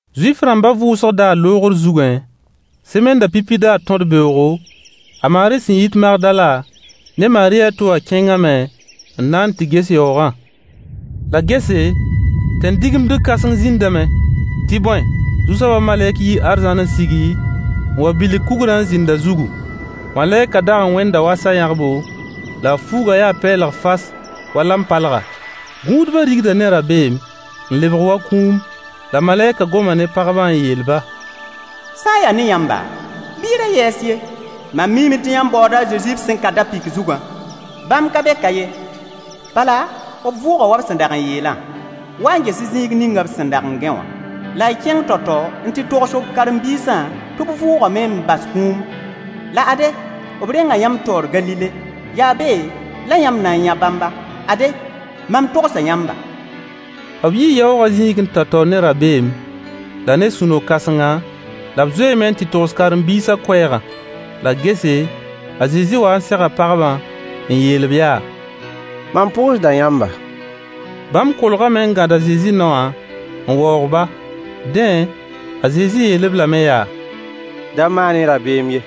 Zuif-rãmbã vʋʋsg daar loogr zugẽ, semennã pipi daar tõd-beoogo, a Maari sẽn yit Magdala, ne Maari a to wã kẽngame n na n tɩ ges yaoogã. La gese, tẽn-digimdg kãseng zĩndame. Tɩ bõe, Zu-soabã malɛk yii arzãn n sigi, n wa bilg kugrã n zĩnd a zugu. Malɛkã dag n wẽnda wa sa-yãgbo, la a fuugã yaa pɛɛlg fas wa lampalga. Gũudba rigda ne rabeem n lebg wa kũum. La malɛkã goma ne pagbã n yeel-ba: Sã n yaa ne yãmba, bɩ y ra yɛɛs ye. Mam miime tɩ yãmb baooda a Zezi b sẽn ka da-pɩk zugã. Bãmb ka be ka ye, bala, b vʋʋga wa b sẽn dag n yeelã. Wa n ges-y zĩig ning b sẽn dag n gãe wã, la y kẽng tao-tao n tɩ togs b karen-biisã tɩ b vʋʋgame n bas kũum. La ade, b renga yãmb taoor Galile. Yaa be la yãmb na n yã bãmba. Ade, mam togsa yãmba. B yii yaoogã zĩigẽ tao-tao ne rabeem, la ne sũ-no-kãsenga, la b zoeeme n tɩ togs karen-biisã koɛɛgã. La gese, a Zezi wa n sega pagbã n yeel-b yaa: Mam pʋʋsda yãmba. Bãmb kolgame n gãd a Zezi naowã n waoog-ba. Dẽ, a Zezi yeel-b lame yaa: Da maan-y rabeem ye.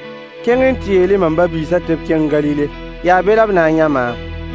Kẽng n tɩ yeel-y m ba-biisã tɩ b kẽng Galile. Yaa be la b na n yã maam.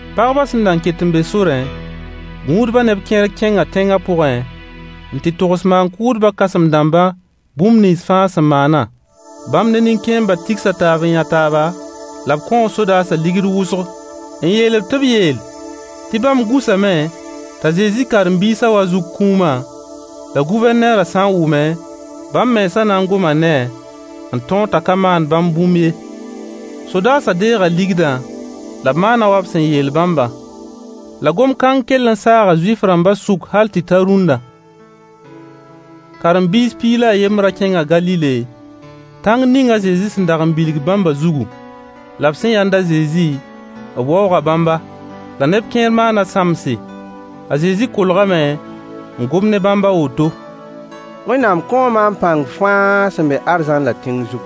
Pagbã sẽn nan ket n be sorẽ, gũudbã neb kẽer kẽnga tẽngã pʋgẽ n tɩ togs maan-kʋʋdbã kãsem-dãmbã bũmb nins fãa sẽn maanã. Bãmb ne nin-kẽembã tigsa taab n yã taaba, la b kõo sodaasã ligd wʋsg n yeel-b tɩ b yeel tɩ bãmb gũsame t'a Zezi karen-biisã wa zuk kũumã, la Gʋvɛrneerã sã n wʋme, bãmb mensã na n goma ne-a n tõog t'a ka maan bãmb bũmb ye. Sodaasã deega ligdã, la b maana wa b sẽn yeel bãmbã. La gom-kãng kell n saaga Zuif-rãmbã sʋk hal tɩ ta rũnna. Karen-biis piig la a yembrã kẽnga Galile, tãng ning a Zezi sẽn dag n bilg bãmbã zugu. La b sẽn yãnd a Zezi, b waooga bãmba. La neb kẽer maana sãmbse. A Zezi kolgame n gom ne bãmb a woto: Wẽnnaam kõo maam pãng fãa sẽn be arzãn la tẽng zugu.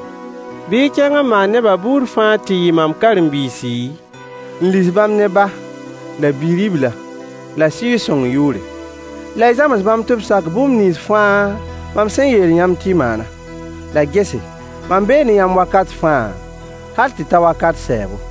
Bɩ y kẽng n maan neba buud fãa tɩ yɩ mam karen-biisi, n lis bãmb ne Ba, la Bi-ribla, la Sɩɩg-sõng yʋʋre, la y zãms bãmb tɩ b sak bũmb nins fãa mam sẽn yeel yãmb tɩ y maanã. La gese, mam bee ne yãmb wakat fãa, hal tɩ ta wakat sɛɛbo.